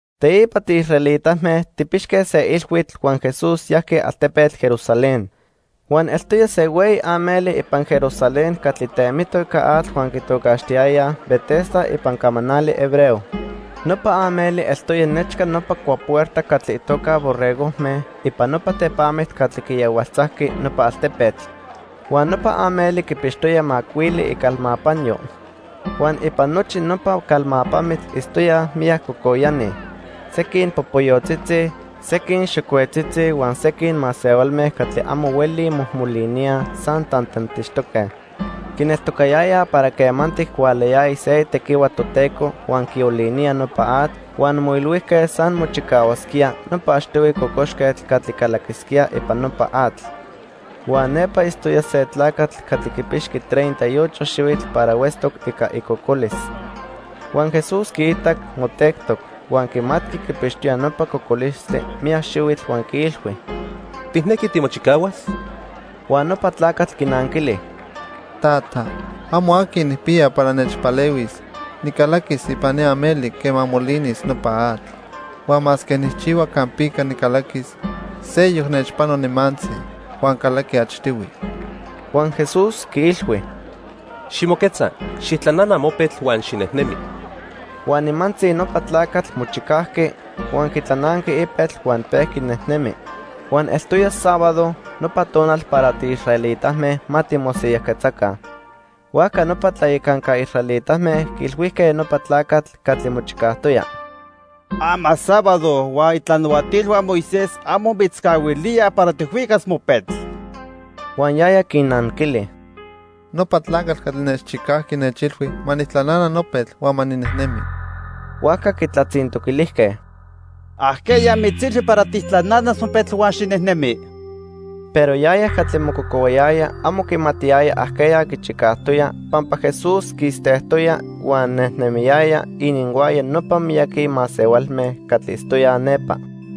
Teipa tiisraelitame tijpixque se ilhuitl huan Jesús yajqui altepetl Jerusalén. Huan eltoya se hueyi ameli ipan Jerusalén catli temitoc ica atl huan quitocaxtiyayaj Betesda ipan camanali hebreo. Nopa ameli eltoya nechca nopa cuapuerta catli itoca "Borregojme" ipan nopa tepamitl catli quiyahualtzajqui nopa altepetl. Huan nopa ameli quipixtoya macuili icalmapanyo. Huan ipan nochi nopa calmapamitl itztoyaj miyac cocoyani; sequin popoyotzitzi, sequin xocuetzitzi huan sequin masehualme catli amo huelij mojmoliníaj, san tantantixtoque. Quineltocayayaj para quemantic hualayaya se itequihua Toteco huan quiolinía nopa atl, huan moilhuijque san mochicahuasquía nopa achtihui cocoxquetl catli calaquisquía ipan nopa atl. Huan nepa itztoya se tlacatl catli quipixqui treinta y ocho xihuitl para huetztoc ica icocolis. Huan Jesús quiitac motectoc, huan quimatqui quipixtoya nopa cocolistli miyac xihuitl huan quiilhui: —¿Tijnequi timochicahuas? Huan nopa tlacatl quinanquili: —Tata, amo aqui nijpiya para nechpalehuis nicalaquis ipan ni ameli quema molinis nopa atl. Huan masque nijchihua campica nicalaquis, seyoc nechpano nimantzi huan calaqui achtihui. Huan Jesús quiilhui: —Ximoquetza, xijtlanana mopetl huan xinejnemi. Huan nimantzi nopa tlacatl mochicajqui, huan quitlananqui ipetl huan pejqui nejnemi. Huan eltoya sábado, nopa tonal para tiisraelitame ma timosiyajquetzaca. Huajca nopa tlayacanca israelitame quiilhuijque nopa tlacatl catli mochicajtoya: —Ama sábado huan itlanahuatilhua Moisés amo mitzcahuilía para tijhuicas mopetl. Huan yaya quinnanquili: —Nopa tlacatl catli nechchicajqui nechilhui ma nijtlanana nopetl huan ma ninejnemi. Huajca quitlatzintoquilijque: —¿Ajqueya mitzilhui para tijtlananas mopetl huan xinejnemi? Pero yaya catli mococohuayaya amo quimatiyaya ajqueya quichicajtoya pampa Jesús quistejtoya huan nejnemiyaya ininhuaya nopa miyaqui masehualme catli itztoyaj nepa.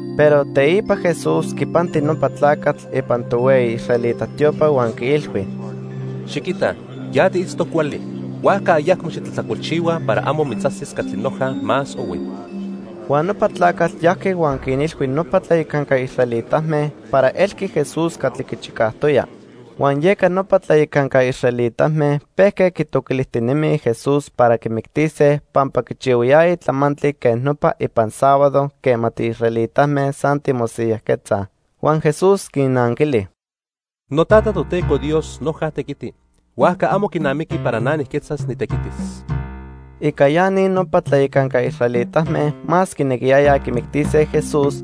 Pero teipa Jesús quipanti nopa tlacatl ipan tohueyi israelita tiopa huan quiilhui: —Xiquita, ya tiitztoc cuali, huajca ayacmo xitlajtlacolchihua para amo mitzajsis catli noja más ohui. Huan nopa tlacatl yajqui huan quinilhui nopa tlayacanca israelitame para elqui Jesús catli quichicajtoya. Huan yeca nopa tlayacanca israelitame pejque quitoquilijtinemij Jesús para quimictise pampa quichihuayaya tlamantli quej nopa ipan sábado quema tiisraelitame san timosiyajquetzaj. Huan Jesús quinnanquili: —NoTata, Toteco Dios noja tequiti, huajca amo quinamiqui para na nijquetzas nitequitis. Ica ya ni nopa tlayacanca israelitame más quinequiyayaj quimictise Jesús,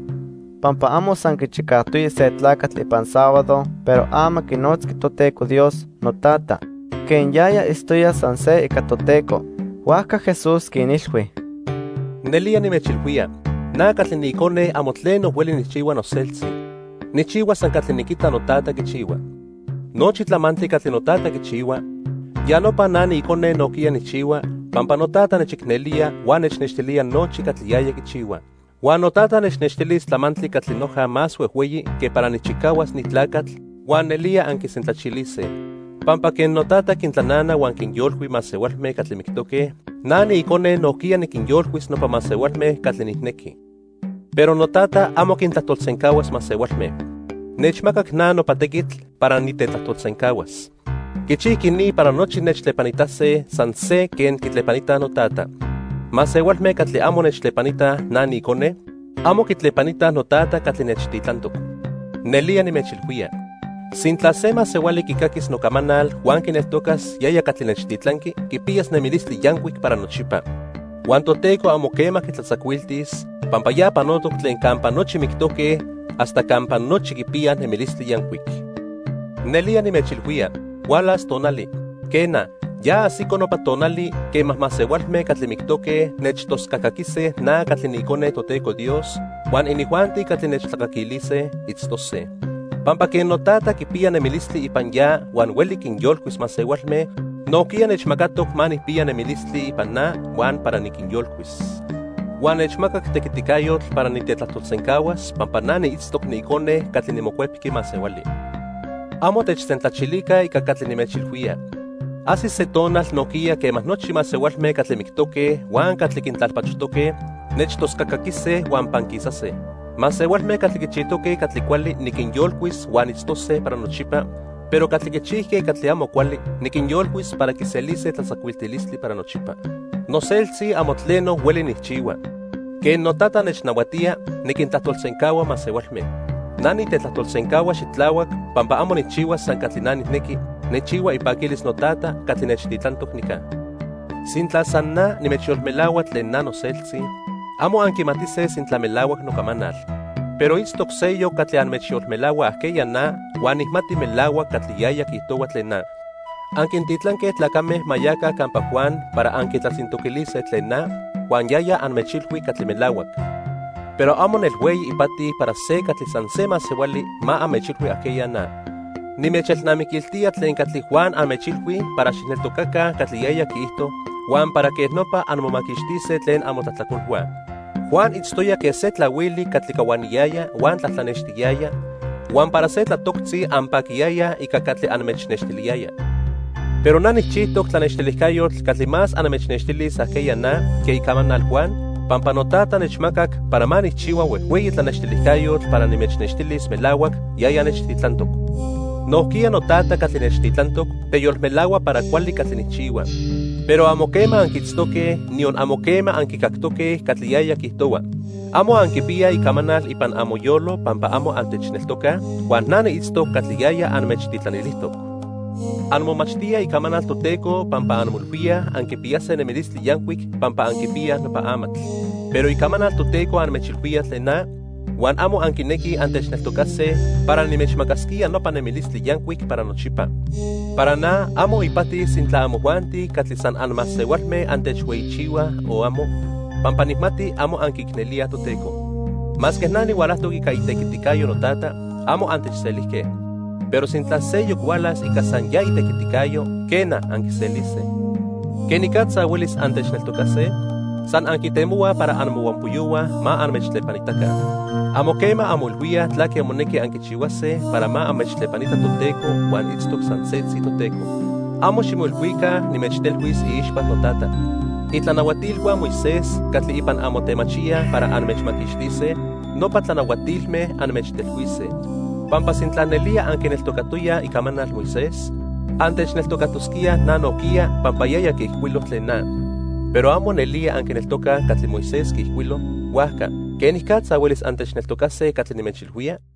pampa amo san quichicajtoya se tlacatl ipan sábado pero ama quinotzqui Toteco Dios: "NoTata", quen yaya itztoya san se ica Toteco. Huajca Jesús quinilhui: "Nelía nimechilhuía, na catli niIcone amo tleno hueli nijchihua noseltzi. Nijchihua san catli niquita noTata quichihua. Nochi tlamantli catli noTata quichihua, ya nopa na niIcone nojquiya nijchihua, pampa noTata nechicnelía huan nechnextilía nochi catli yaya quichihua. Huan noTata nechnextilis tlamantli catli noja más huejhueyi que para nijchicahuas ni tlacatl, huan nelía anquisentlachilise. Pampa quen noTata quintlanana huan quinyolcui masehualme catli mictoque, na niIcone nojquiya niquinyolcuis nopa masehualme catli nijnequi. Pero noTata amo quintlajtolsencahuas masehualme. Nechmacac na nopa tequitl para nitetlajtolsencahuas. Quichijqui ni para nochi nechtlepanitase san se quen quitlepanitaj noTata. Masehualme catli amo nechtlepanitaj na niIcone, amo quitlepanitaj noTata catli nechtitlantoc. "Nelía nimechilhuía, sintla se masehuali quicaquis nocamanal huan quineltocas yaya catli nechtitlanqui, quipiyas nemilistli yancuic para nochipa. Huan Toteco amo quema quitlatzacuiltis, pampa ya panotoc tlen campa nochi mictoque hasta campa nochi quipiyaj nemilistli yancuic. Nelía nimechilhuía, hualas tonali, quena, ya ajsico nopa tonali quema masehualme catli mictoque nechtoscacaquise na catli niIcone Toteco Dios, huan inijuanti catli nechtlacaquilise, itztose. Pampa quen noTata quipiya nemilistli ipan ya huan hueli quinyolcuis masehualme, nojquiya nechmacatoc ma nijpiya nemilistli ipan na huan para niquinyolcuis. Huan nechmacac tequiticayotl para nitetlajtolsencahuas pampa na niitztoc niIcone catli niMocuepqui Masehuali. Amo techsentlachilica ica catli nimechilhuía. Ajsis se tonal nojquiya quema nochi masehualme catli mictoque huan catli quintlalpachojtoque, nechtoscacaquise huan panquisase. Masehualme catli quichijtoque catli cuali niquinyolcuis huan itztose para nochipa, pero catli quichijque catli amo cuali niquinyolcuis para quiselise tlatzacuiltilistli para nochipa. "Noseltzi amo tleno hueli nijchihua. Quen noTata nechnahuatía, niquintlajtolsencahua masehualme. Na nitetlajtolsencahua xitlahuac pampa amo nijchihua san catli na nijnequi, nijchihua ipaquilis noTata catli nechtitlantoc nica. Sintla san na nimechyolmelahua tlen na noseltzi, amo anquimatise sintla melahuac nocamanal. Pero itztoc seyoc catli anmechyolmelahua ajqueya na huan nijmati melahuac catli yaya quiijtohua tlen na. Anquintitlanque tlacame ma yaca campa Juan para anquitlatzintoquilise tlen na, huan yaya anmechilhui catli melahuac. Pero amo nel hueyi ipati para se catli san se masehuali ma anmechilhui ajqueya na. Nimechelnamiquiltía tlen catli Juan anmechilhui para xijneltocaca catli yaya quiijto huan para quej nopa anmomaquixtise tlen amotlajtlacolhua. Juan itztoya quen se tlahuili catli cahuaniyaya huan tlatlanextiyaya, huan para se tlatoctzi anpaquiyayaj ica catli anmechnextiliyaya. Pero na nijchijtoc tlanextilijcayotl catli más anmechnextilis ajqueya na que icamanal Juan, pampa noTata nechmacac para ma nijchihua huejhueyi tlanextilijcayotl para nimechnextilis melahuac yaya nechtitlantoc. Nojquiya noTata catli nechtitlantoc teyolmelahua para cuali catli nijchihua. Pero amo quema anquiitztoque, niyon amo quema anquicactoque catli yaya quiijtohua. Amo anquipiyaj icamanal ipan amoyolo pampa amo antechneltocaj, huan na niitztoc catli yaya anmechtitlanilijtoc. Anmomachtíaj Icamanal Toteco pampa anmoilhuíaj anquipiyase nemilistli yancuic pampa anquipiyaj nopa amatl. Pero Icamanal Toteco anmechilhuía tlen na, huan amo anquinequij antechneltocase para nimechmacasquía nopa nemilistli yancuic para nochipa. "Para na, amo ipati sintla amojuanti catli san anmasehualme antechhueyichihuaj o amo, pampa nijmati amo anquiicnelíaj Toteco. Masque na nihualajtoc ica itequiticayo noTata, amo antechselijque. Pero sintla seyoc hualas ica san ya itequiticayo, quena, anquiselise. ¿Quenicatza huelis antechneltocase? San anquitemohuaj para amohuampoyohua ma anmechtlepanitaca. Amo quema anmoilhuíaj tlaque monequi anquichihuase para ma anmechtlepanita Toteco huan itztoc san setzi Toteco. Amo ximoilhuica nimechtelhuis iixpa noTata. Itlanahuatilhua Moisés catli ipan anmotemachíaj para anmechmaquixtise, nopa tlanahuatilme anmechtelhuise. Pampa sintla nelía anquineltocatoyaj icamanal Moisés, antechneltocatosquíaj na nojquiya, pampa yaya quiijcuilo tlen na. Pero amo nelía anquineltocaj catli Moisés quiijcuilo; huajca ¿quenicatza huelis antechneltocase catli nimechilhuía?"